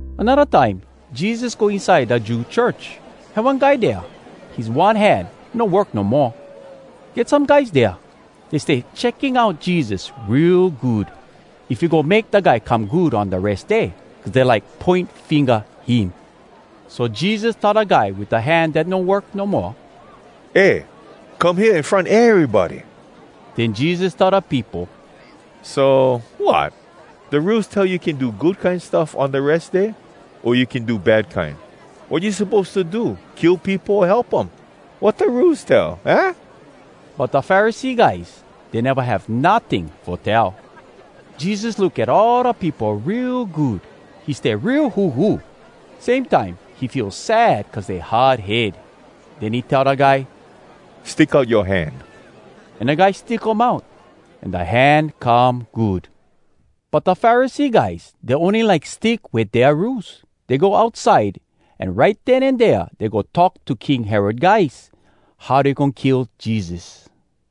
Anodda time Jesus go inside da Jew church. Had one guy dea, his one hand no work no moa. Get some guys dea. Dey stay checking out Jesus real good, if he go make da guy come good on da Res Day, cuz dey like poin finga him. So Jesus tell da guy wit da hand dat no work no moa, “Eh, come hea in front erybody!” Den Jesus tell da peopo, “So, wat? Da Rules tell you can do good kine stuff on da Res Day, o you can do bad kine? Wat you suppose to do, kill peopo o help um? Wat da Rules tell, aah?” But da Pharisee guys, dey neva have notting fo tell. Jesus look at all da peopo real good. He stay real huhu. Same time, he feel sad cuz dey hard head. Den he tell da guy, “Stick out yoa hand.” An da guy stick um out, an da hand come good. But da Pharisee guys, dey ony like stick wit dea rules. Dey go outside, an right den an dea dey go talk to King Herod guys, how dey goin kill Jesus.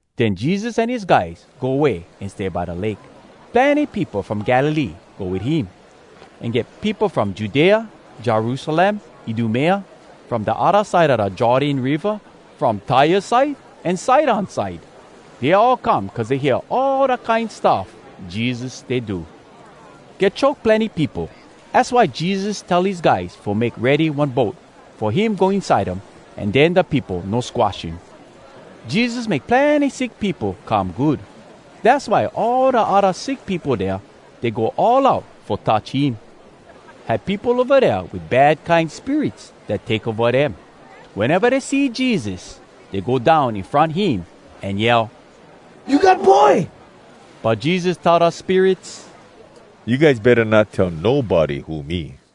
Den Jesus an his guys go way an stay by da lake. Plenny peopo from Galilee go wit him. An get peopo from Judea, Jerusalem, Idumea, from da odda side a da Jordan Riva, from Tyre side, an Sidon side. Dey all come cuz dey hear all da kine stuff Jesus stay do. Get choke plenny peopo, Az why Jesus tell his guys fo make ready one boat, fo him go inside um an den da peopo no squash him. Jesus make plenny sick peopo come good. Dass why all da odda sick peopo dea, dey go all out fo touch him. Had peopo ova dea wit bad kine spirits dat take ova dem. Weneva dey see Jesus, dey go down in front him, an yell, “You God Boy!” But Jesus tell da spirits, “You guys betta not tell nobody who me.”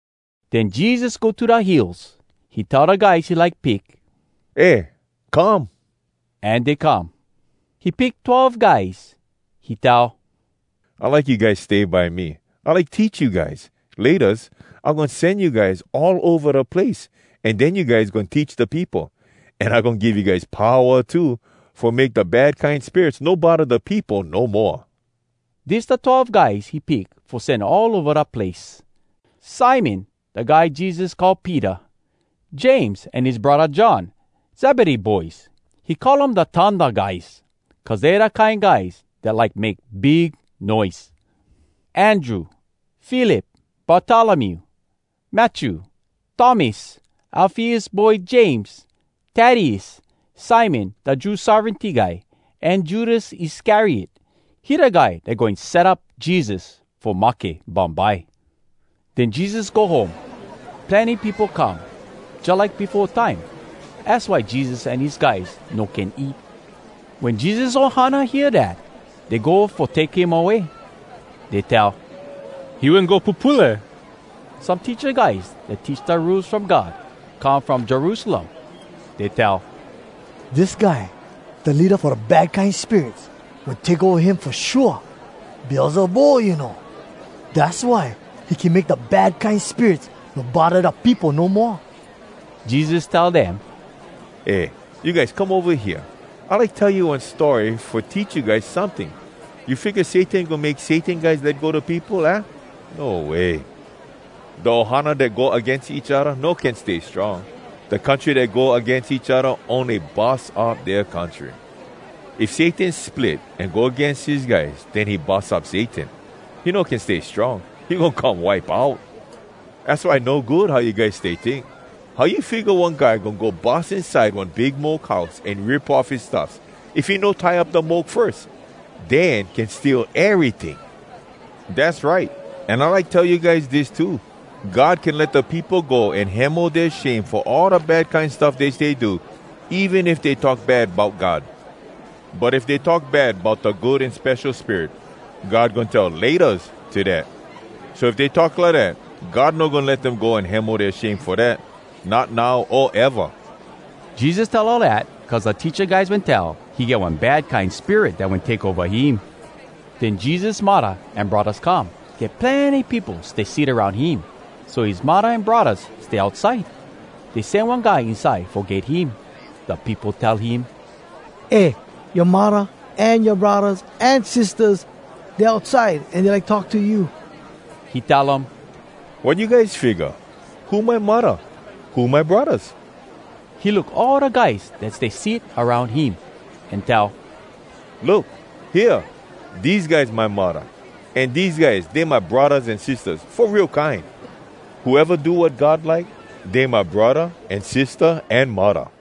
Den Jesus go to da hills. He tell da guys he like pick, “Eh, come!” An dey come. He pick twelve guys. He tell, “I like you guys stay by me. I like teach you guys. Laytas I goin sen you guys all ova da place, an den you guys goin teach da peopo. An I goin give you guys powa too fo make da bad kine spirits no bodda da peopo no moa.” Dis da twelve guys he pick fo sen all ova da place: Simon, da guy Jesus call “Peter,” James an his braddah John, Zebedee boys. He call um “Da Thunder Guys,” cuz dey da kine guys dat like make big noise. Andrew, Philip, Bartolomew, Matthew, Thomas, Alfeus boy James, Taddeus, Simon da Jew Sovereignty guy, an Judas Iscariot. He da guy dat goin set up Jesus fo mahke bumbye. Den Jesus go home. Plenny peopo come, jalike befo time, az why Jesus an his guys no can eat. Wen Jesus ohana hear dat, dey go fo take him away. Dey tell, “He wen go pupule!” Some teacha guys dat teach da Rules From God come from Jerusalem. Dey tell, “Dis guy, da leada fo da bad kine spirits wen take ova him fo shua! Beelzebul, you know! Dass why he can make da bad kine spirits no bodda da peopo no moa!” Jesus tell dem, “Eh, you guys, come ova hea! I like tell you one story fo teach you guys someting. You figga Satan goin make Satan guys let go da peopo, aah? No way! Da ohana dat go agains each odda no can stay strong. Da country dat go agains each odda ony bus up dea country. If Satan split an go agains his guys, den he bus up Satan! He no can stay strong. He goin come wipe out! “Az why no good how you guys stay tink! How you figga one guy goin go bus inside one big moke house an rip off his stuffs, if he no tie up da moke firs? Den can steal eryting. “Dass right! An I like tell you guys dis too: God can let da peopo go an hemo dea shame fo all da bad kine stuff dey stay do, even if dey talk bad bout God. But if dey talk bad bout da Good An Spesho Spirit, God goin tell ‘Laytas’ to dat. So if dey talk lidat, God no goin let dem go an hemo dea shame fo dat, not now o eva!” Jesus tell all dat cuz da teacha guys wen tell, “He get one bad kine spirit dat wen take ova him.” Den Jesus muddah an braddahs come. Get plenny peopo stay sit aroun him, so his muddah an braddahs stay outside. Dey sen one guy inside fo get him. Da peopo tell him, “Eh, yoa muddah an yoa braddahs an sistahs, dey outside, an dey like talk to you.” He tell um, “Wat you guys figga? Who my muddah? Who my braddahs?” He look all da guys dat stay sit aroun him, an tell, “Look! Hea, dese guys my muddah! An dese guys, dey my braddahs an sistahs, fo real kine! Whoeva do wat God like, dey my braddah an sistah an muddah!”